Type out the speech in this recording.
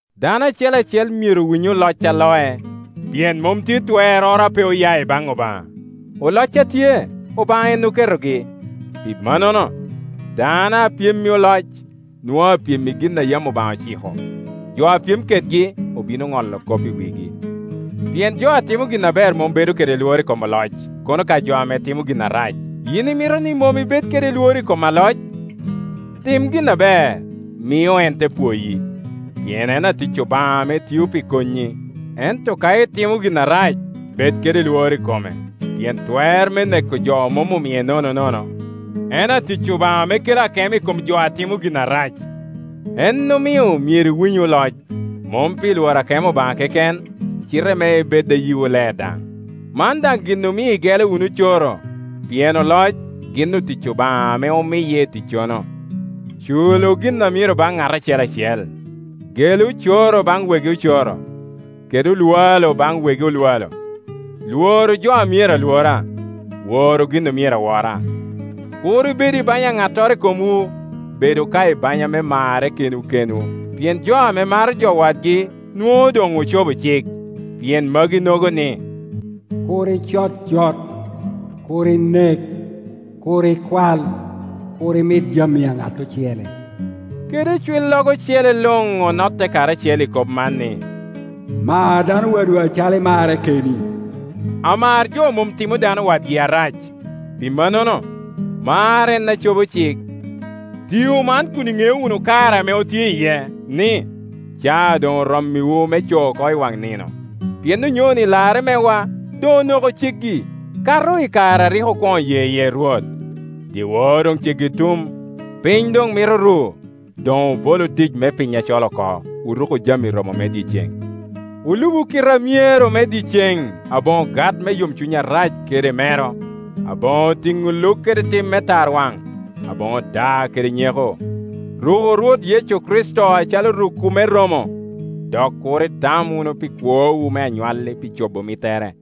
Dano acel acel myero winy oloc a loc; pien mom tye twerroro a pe oya i baŋ Obaŋa; oloc a tye, Obaŋa en oketogi. Pi mannono, dano a pyem i oloc, nwoŋo apyem i gin a yam Obaŋa ociko; jo a pyem kedgi obino ŋolo kop i wigi. Pien jo a timo gin aber mom bedo kede lworo moro i kom oloc, kono ka jo a timo gin arac. Yin imito ni mom ibed kede lworo i kom aloc? Tim gin aber, mio en te pwoyi; pien en atic Obaŋa ame tio pi konyi, Ento ka itimo gin arac, bed kede lworo i kome, pien twer me neko jo mom omie nononono, En atic Obaŋa ame kelo akemo i kom jo a timo gin arac. En omio myero iwinyu oloc, mom pi lworo akemo Obaŋa keken, cite me ibed a yiwu ler daŋ. Man daŋ gin omio igelo wunu ocoro, pien oloc gin otic Obaŋa ame omiye i ticcono. Culu gin a myero baŋ ŋat acel acel; gelu ocoro baŋ wegi ocoro, kede oŋwalo baŋ wegi oŋwalo, lworu jo a myero alwora, woru gin a myero awora. Kur ibedu i banya a ŋattoro i komwu, Bedu ka i banya me marre kenwu kenwu; pien jo ame maro jo wadgi nwoŋo doŋ ocobo cik. Pien maginogo ni, “Kur icod cot, Kur inek, Kur ikwal, Kur imit jami a ŋat ocele,” kede icwillogo ocele luŋ onotte karacel i kop man ni, “Mar dano wadwu acalo imarre keni.” Amar jo mom timo dano wadgi arac; pi mannono, mar en a cobo cik. Tiu man kun iŋeo wunu kare ame otye iye, ni, caa doŋ orommiwu me cooko i waŋ nino; pien onyoni larre mewa doŋ onoko ceggi, kato i kare a rik okwoŋo ye iye Rwot. Dyewor doŋ ceggi tum, piny doŋ mito ru. Doŋ obolu tic me piny acol oko, oruku jami romo me dyeceŋ. Olubu kite a myero me dyeceŋ, aboŋo gat me yomcuny arac kede mero, aboŋo tiŋo luk kede tim me tarwaŋ, aboŋo daa kede nyeko. Ruku Rwot Yecu Kricito acalo rukwu me romo, dok kur itam wunu pi kwowu me anywalli pi cobo mittere.